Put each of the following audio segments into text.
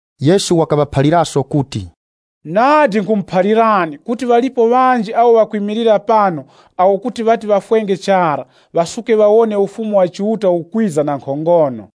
Yesu wakaŵaphaliraso kuti, “Nadi nkhumuphalirani kuti ŵalipo ŵanji awo ŵakwimilira pano awo kuti ŵati ŵafwenge chara, ŵasuke ŵawone Ufumu wa Chiuta ukwiza na nkhongono.”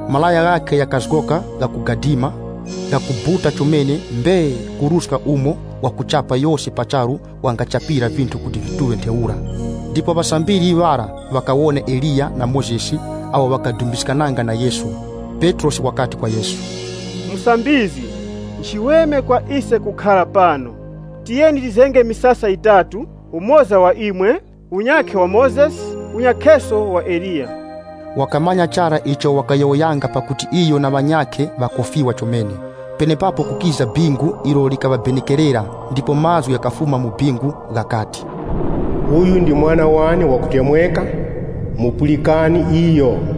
Malaya ghakhe ghakazgoka ghakugadima, ghakubuta chomene mbee kuruska umo wakuchapa yose pa charu wangachapira vinthu kuti vituŵe ntheura. Ndipo ŵasambiri ŵara ŵakawona Eliya na Mozesi awo ŵakadumbiskananga na Yesu. Petrosi wakati kwa Yesu, “Musambizgi, nchiweme kwa ise kukhara pano. Tiyeni tizenge misasa yitatu, umoza wa imwe, unyakhe wa Mozesi, unyakheso wa Eliya.” Wakamanya chara icho wakayowoyanga pakuti iyo na ŵanyakhe ŵakofiwa chomene. Penepapo kukiza bingu ilo likaŵabenekerera ndipo mazgu ghakafuma mu bingu ghakati, “Uyu ndi Mwana wane wakutemweka. Mupulikani iyo.”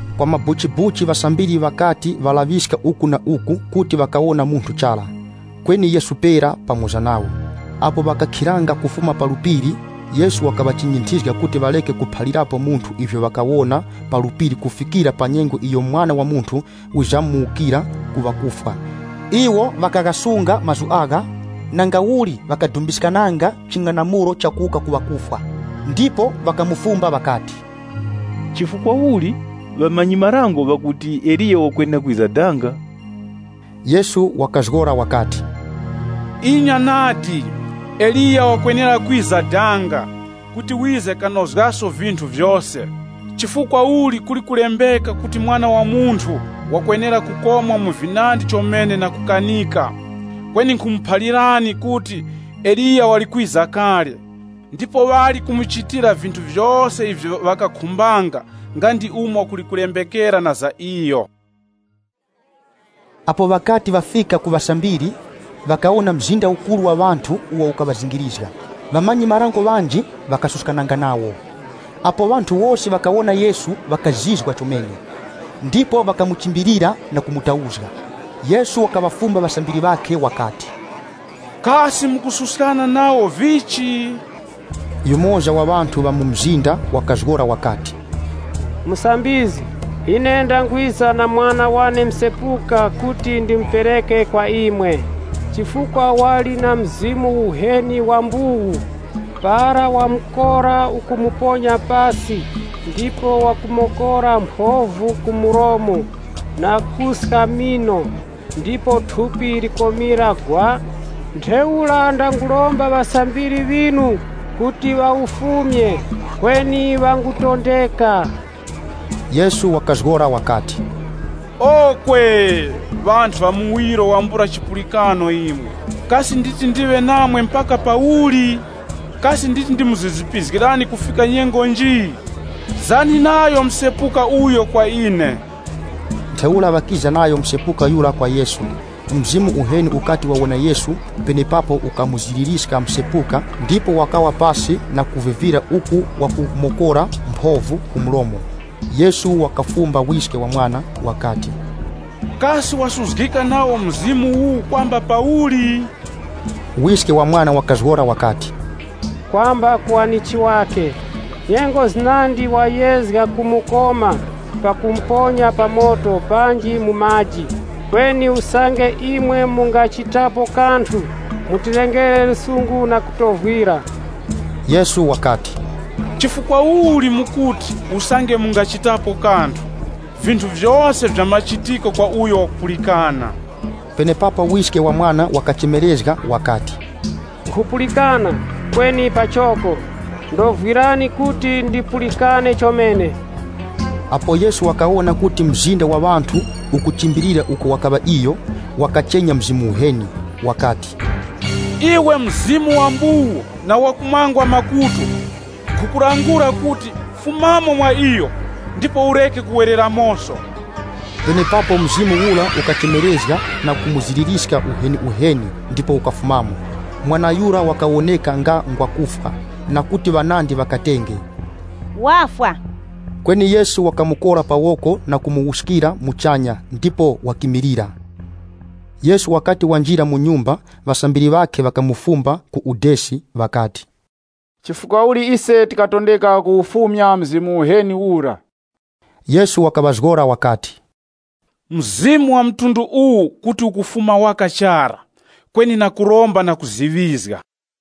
Kwa mabuchibuchi ŵasambiri ŵakati ŵalaŵiska uku na uku kuti ŵakawona munthu chara, kweni Yesu pera pamoza nawo. Apo ŵakakhiranga kufuma pa phiri, Yesu wakaŵachinyinthizga kuti ŵareke kuphalirapo munthu ivyo ŵakawona pa phiri kufikira pa nyengo iyo Mwana wa Munthu wizamuwukira ku ŵakufwa. Iwo ŵakaghasunga mazgu agha, nangauli ŵakadumbiskananga ching'anamulo cha kuwuka ku ŵakufwa. Ndipo ŵakamufumba ŵakati, “Chifukwa uli ŵamanyi-marango ŵakuti, Eliya wakwenera kwiza danga?” Yesu wakazgora wakati, “Inya nadi, Eliya wakwenera kwiza danga kuti wize kanozgeso vinthu vyose. Chifukwa uli kuli kulembeka kuti Mwana wa Munthu wakwenera kukomwa mu vinandi chomene na kukanika? Kweni nkhumuphalirani kuti Eliya wali kwiza kale, ndipo ŵali kumuchitira vinthu vyose ivyo ŵakakhumbanga nga ndi umo kuli kulembekera na za iyo.” Apo ŵakati ŵafika ku ŵasambiri, ŵakawona mzinda ukuru wa ŵanthu uwo ukaŵazingirizga. Ŵamanyi-marango ŵanji ŵakasuskananga nawo. Apo ŵanthu wose ŵakawona Yesu ŵakazizwa chomene, ndipo ŵakamuchimbilira na kumutauzga. Yesu wakaŵafumba ŵasambiri ŵakhe wakati, “Kasi mukususkana nawo vichi?” Yumoza wa ŵanthu ŵa mu mzinda wakazgora wakati, “Musambizgi, ine ndangwiza na mwana wane msepuka kuti ndimupereke kwa imwe chifukwa wali na mzimu uheni wa mbuwu. Para wamukora ukumuponya pasi ndipo wakumokora mphovu ku mlomo na kuska mino, ndipo thupi likomira gwa. Ntheura ndanguromba ŵasambiri ŵinu kuti ŵawufumyemo, kweni ŵangutondeka.” Yesu wakazgora wakati, “Okwe! Ŵanthu ŵa muwiro wambula chipulikano imwe, kasi nditi ndiwe namwe mpaka pauli? Kasi nditi ndimuzizipizgirani kufika nyengo nji? Zani nayo msepuka uyo kwa ine.” Ntheura ŵakiza nayo msepuka yura kwa Yesu. Mzimu uheni ukati wawona Yesu, penepapo ukamuziririska msepuka ndipo wakawa pasi na kuvivira uku wakumokora mphovu ku mlomo. Yesu wakafumba wiske wa mwana wakati, “Kasi wasuzgika nawo mzimu uwu kwamba pauli?” Wiske wa mwana wakazgora wakati, “Kwamba ku wanichi wakhe. Nyengo zinandi wayezga kumukoma pakumuponya pa moto, panji mu maji. Kweni usange imwe mungachitapo kanthu, muŵe na chiwuravi na kutovwira.” Yesu wakati, “Chifukwa uli mukuti, ‘Usange mungachitapo kanthu?’ Vinthu vyose nvya machitiko kwa uyo wakupulikana.” Penepapo wiske wa mwana wakachemerezga wakati, “Nkhupulikana, kweni pachoko. Ndovwirani kuti ndipulikane chomene.” Apo Yesu wakawona kuti mzinda wa ŵanthu ukuchimbilira uko wakaŵa iyo, wakachenya mzimu uheni wakati, “Iwe mzimu wa mbuwu na wakumangwa makutu, nkhukulangula kuti, fumamo mwa iyo, ndipo ureke kuwereramoso.” Penepapo mzimu ura ukachemerezga na kumuziririska uheniuheni ndipo ukafumamo. Mwana yura wakawoneka nga ngwa kufwa, na kuti ŵanandi ŵakatenge, “Wafwa!” Kweni Yesu wakamukora pa woko na kumuwuskira muchanya ndipo wakimilira. Yesu wakati wanjira mu nyumba, ŵasambiri ŵakhe ŵakamufumba ku udesi ŵakati, “Chifukwa uli ise tikatondeka kuwufumya mzimu uheni ura?” Yesu wakaŵazgora wakati, “Mzimu wa mtundu uwu kuti ukufuma waka chara, kweni na kuromba na kuziŵizga.”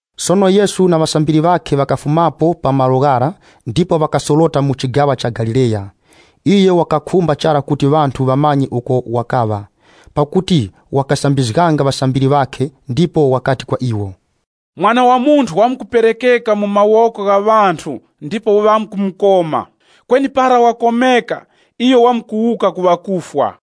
Sono Yesu na ŵasambiri ŵakhe ŵakafumapo pa malo ghara, ndipo ŵakasorota mu chigaŵa cha Galileya. Iyo wakakhumba chara kuti ŵanthu ŵamanye uko wakaŵa, pakuti wakasambizganga ŵasambiri ŵakhe, ndipo wakati kwa iwo, “Mwana wa Munthu wamkuperekeka mu mawoko gha ŵanthu ndipo ŵamkumukoma. Kweni para ŵakomeka, iyo wamkuwuka ku ŵakufwa.”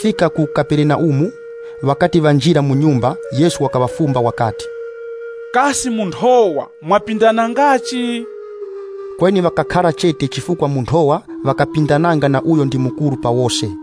Ndipo ŵakafika ku Kaperenaumu. Ŵakati ŵanjira mu nyumba, Yesu wakaŵafumba wakati, “Kasi mu nthowa mwapindanangachi?” Kweni ŵakakhara chete chifukwa mu nthowa ŵakapindananga na uyo ndi mukuru pa wose.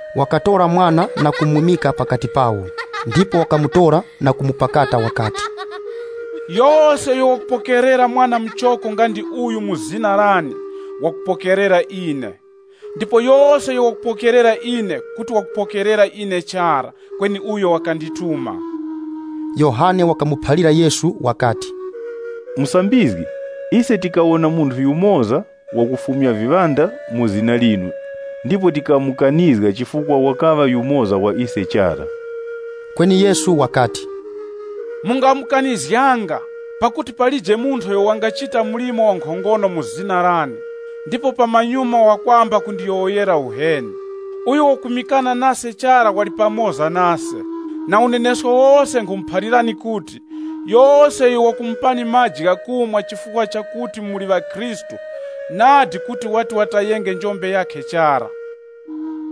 Wakatora mwana na kumwimika pakati pawo. Ndipo wakamutora na kumupakata wakati, “Yose uyo wakupokerera mwana muchoko nga ndi uyu mu zina lane, wakupokerera ine. Ndipo yose uyo wakupokerera ine kuti wakupokerera ine chara, kweni uyo wakandituma.” Yohane wakamuphalira Yesu wakati, “Musambizgi, ise tikawona munthu yumoza wakufumya viŵanda mu zina linu, ndipo tikamukanizga chifukwa wakaŵa yumoza wa ise chara.” Kweni Yesu wakati, Mungamukanizganga, pakuti palije munthu uyo wangachita mlimo wankhongono mu zina lane, ndipo pamanyuma wakwamba kundiyowoyera uheni. Uyo wakwimikana nase chara wali pamoza nase. Na unenesko wose nkhumuphalirani kuti, yose uyo wakumupani maji ghakumwa chifukwa chakuti muli ŵa Khristu, nadi, kuti wati watayenge njombe yakhe chara.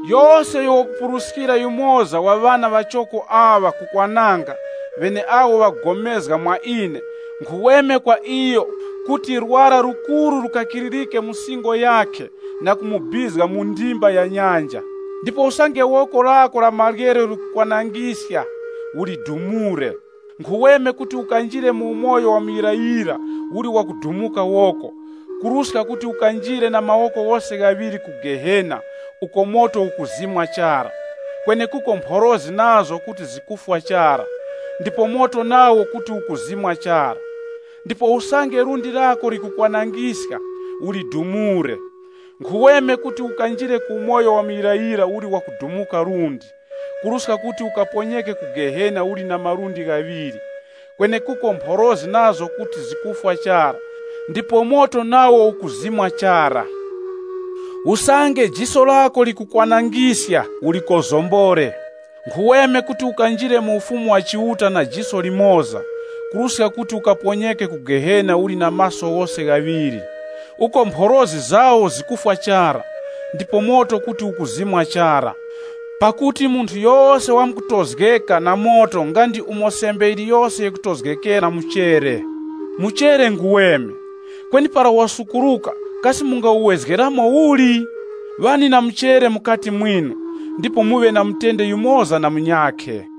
“Yose uyo wakupuruskira yumoza wa ŵana ŵachoko aŵa ku kwananga, ŵeneawo ŵakupulikana mwa ine nkhuweme kwa iyo kuti lwara lukuru lukakiririke mu singo yakhe na kumubizga mu ndimba ya nyanja. Ndipo usange woko lako la maryero likukwanangiska, ulidumureko. Nkhuweme kuti ukanjire mu umoyo wa muyirayira uli wakudumuka woko, kuruska kuti ukanjire na mawoko ghose ghaŵiri ku Gehena uko moto ukuzimwa chara. [ Kwenekuko mphorozi nazo kuti zikufwa chara, ndipo moto nawo kuti ukuzimwa chara.] Ndipo usange lundi lako likukwanangiska, ulidumureko. Nkhuweme kuti ukanjire ku umoyo wa muyirayira uli wakudumuka lundi, kuruska kuti ukaponyeke ku Gehena uli na malundi ghaŵiri. [ Kwenekuko mphorozi nazo kuti zikufwa chara, ndipo moto nawo ukuzimwa chara.] Usange jiso lako likukwanangiska ulikozombore. Nkhuweme kuti ukanjire mu Ufumu wa Chiuta na jiso limoza kuruska kuti ukaponyeke ku Gehena uli na maso ghose ghaŵiri. Uko ‘Mphorozi zawo zikufwa chara, ndipo moto kuti ukuzimwa chara.’ “Pakuti munthu yose wamkutozgeka na moto nga ndi umo sembe yiliyose yikutozgeka na muchere. “Muchere nguweme, kweni para wasukuruka kasi mungawuwezgeramo uli? “Ŵani na muchere mukati mwinu ndipo muŵe na mutende yumoza na munyakhe.”